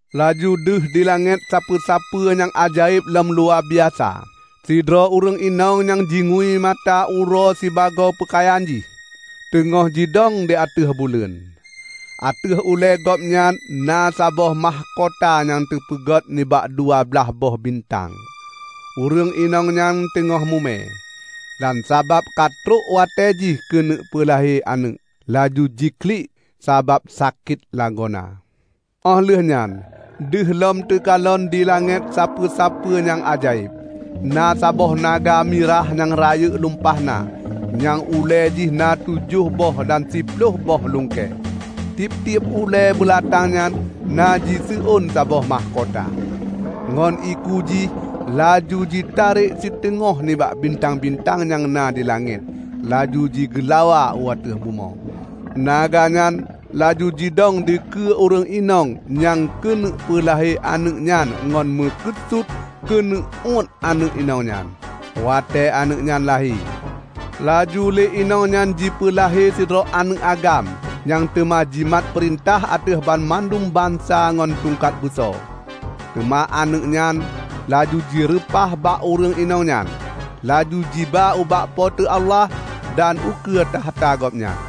Laju deuh di langét sapeue-sapeue nyang ajaéb lom luwabiasa. Sidroe ureuëng inong nyang jingui mata uroe sibagoe peukayan jih, teungoh jidong di ateueh buleuen. Ateueh ulée gobnyan na saboh mahkota nyang teupeuget nibak dua blah boh bintang. Ureuëng inong nyan teungoh mume, dan sabab ka trok watée jih keuneuk peulahé aneuëk, laju jiklik sabab sakét lagoena. Óh lheueh nyan deuh lom teukalon di langét sapeue-sapeue nyang ajaéb. Na saboh naga mirah nyang rayeuk lumpah na nyang ulée jih na tujoh boh dan siploh boh lungkée. Tieb-tieb ulée beulatang nyan na jiseuôn saboh mahkota. Ngon iku jih laju jitarek siteungoh nibak bintang-bintang nyang na di langét laju jigeulawa u ateueh bumoe. Naga nyan laju jidong dikeue ureuëng inong nyang keuneuk peulahé aneuëk nyan ngon meukeusut keuneuk uét aneuëk inong nyan, watée aneuëk nyan lahé. Laju lé inong nyan jipeulahé sidroe aneuëk agam nyang teuma jimat peurintah ateueh banmandum bansa ngon tungkat beuso. Teuma aneuëk nyan laju jireupah bak ureuëng inong nyan, laju jiba ubak Po teu Allah dan ukeue takhta Gobnyan.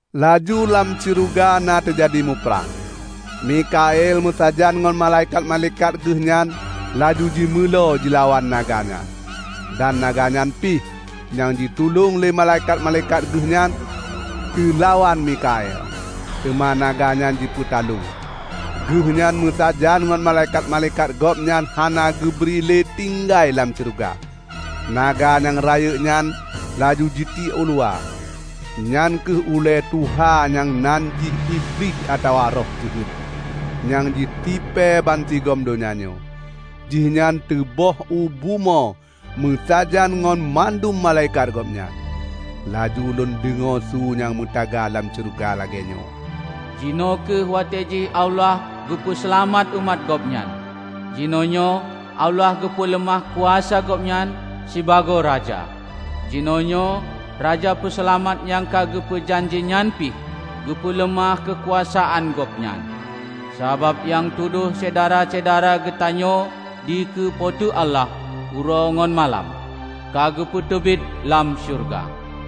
Laju lam syeuruga na teujadi muprang. Mikhael meusajan ngon malaikat-malaikat geuh nyan laju jimeulo jilawan naga nyan. Dan naga nyan pih, nyang jitulông lé malaikat-malaikat geuh nyan, teulawan Mikhael. Teuma naga nyan jipeutaloe. Geuhnyan meusajan ngon malaikat-malaikat gobnyan hana geubri lé tinggai lam syeuruga. Naga nyang rayeuk nyan laju jitiek uluwa! Nyan kheueh uleue tuha nyan nyang nan jih Iblih atawa Roh Jeuhet, nyang jitipée bansigom donya nyoe. Jihnyan teuböh u bumoe meusajan ngon mandum malaikat gobnyan. Laju lôn deungoe su nyang meutaga lam syeuruga lagée nyoe, "Jinoe kheueh watée jih Allah geupeu seulamat umat Gobnyan! Jinoenyoe Allah geupeuleumah kuasa Gobnyan sibagoe Raja! Jinoenyoe Raja Peuseulamat nyang ka geupeu janji nyan pih geupeuleumah keukuasaan Gobnyan! Sabab nyang tudoh syedara-syedara geutanyoe dikeue Po teu Allah uroe ngon malam, ka geupeuteubiet lam syeuruga.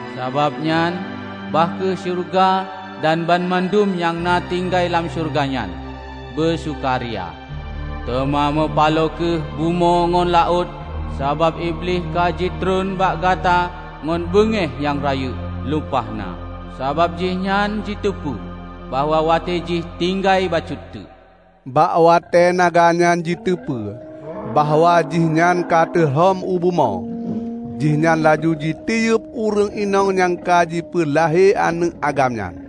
Sabab nyan, bah kheueh syeuruga dan banmandum nyang na tinggai lam syeuruga nyan, beusukaria! Teuma meupaloe kheueh bumoe ngon laôt, sabab Iblih ka jitreun bak gata ngon beungéh nyang rayeuk lumpah na, sabab jihnyan jiteupeue bahwa watée jih tinggai bacut teuk." Bak watée naga nyan jiteupeue bahwa jihnyan ka teurhom u bumoe, jihnyan laju jitiyeub ureuëng inong nyang ka jipeulahé aneuëk agam nyan.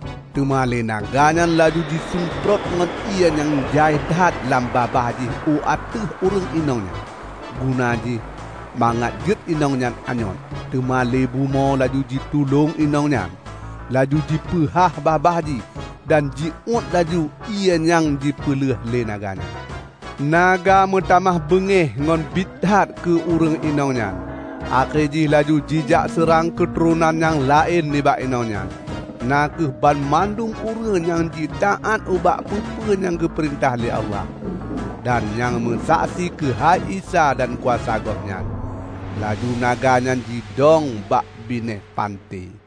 Teuma lé naga nyan laju jisumprot ngon ié nyang jai that lam babah jih u ateueh ureuëng inong nyan, guna jih mangat jeuet inong nyan anyôt. Teuma lé bumoe laju jitulông inong nyan; laju jipeuhah babah jih dan jiúet laju ié nyang jipeuleueh lé naga nyan. Naga meutamah beungéh ngon bit that keu ureuëng inong nyan, akhé jih laju jijak seurang keuturonan nyang laén nibak inong nyan, na kheueh banmandum ureuëng nyang jitaát ubak peue-peue nyang geupeurintah lé Allah, dan nyang meusaksi keuhai Isa dan kuasa Gobnyan. Laju naga nyan jidong bak binéh panté.